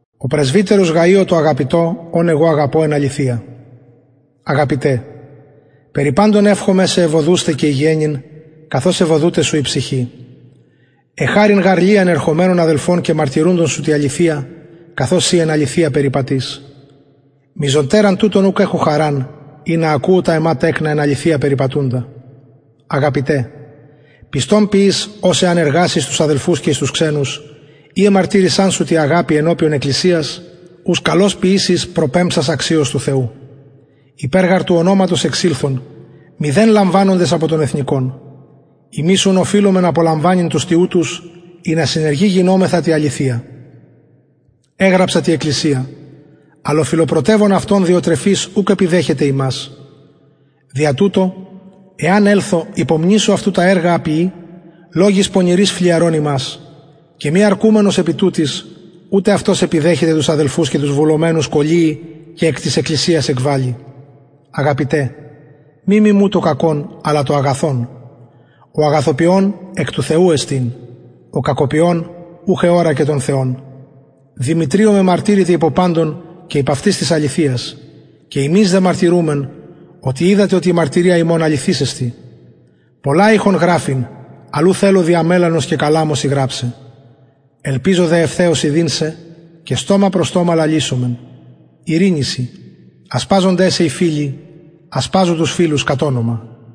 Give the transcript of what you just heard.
ο πρεσβυτερος γαιω τω αγαπητω ον εγω αγαπω εν αληθεια αγαπητε περι παντων ευχομαι σε ευοδουσθαι και υγιαινειν καθως ευοδουται σου η ψυχη εχαρην γαρ λιαν ερχομενων αδελφων και μαρτυρουντων σου τη αληθεια καθως συ εν αληθεια περιπατεις μειζοτεραν τουτων ουκ εχω χαραν ινα ακουω τα εμα τεκνα εν αληθεια περιπατουντα αγαπητε πιστον ποιεις ο εαν εργαση εις τους αδελφους και εις τους ξενους οι εμαρτυρησαν σου τη αγαπη ενωπιον εκκλησιας ους καλως ποιησεις προπεμψας αξιως του θεου υπερ γαρ του ονοματος εξηλθον μηδεν λαμβανοντες απο των εθνων ημεις ουν οφειλομεν απολαμβανειν τους τοιουτους ινα συνεργοι γινωμεθα τη αληθεια εγραψα τη εκκλησια αλλ ο φιλοπρωτευων αυτων διοτρεφης ουκ επιδεχεται ημας δια τουτο εαν ελθω υπομνησω αυτου τα εργα α ποιει λογοις πονηροις φλυαρων ημας και μη αρκουμενος επι τουτοις ουτε αυτος επιδεχεται τους αδελφους και τους βουλομενους κωλυει και εκ της εκκλησιας εκβαλλει αγαπητε μη μιμου το κακον αλλα το αγαθον ο αγαθοποιων εκ του θεου εστιν ο κακοποιων ουχ εωρακεν τον θεον δημητριω μεμαρτυρηται υπο παντων και υπ αυτης της αληθειας και ημεις δε μαρτυρουμεν και οιδατε οτι η μαρτυρια ημων αληθης εστιν πολλα ειχον γραφειν αλλ ου θελω δια μελανος και καλαμου σοι γραψαι ελπιζω δε ευθεως ιδειν σε και στομα προς στομα λαλησομεν ειρηνη σοι ασπαζονται σε οι φιλοι ασπαζου τους φιλους κατ ονομα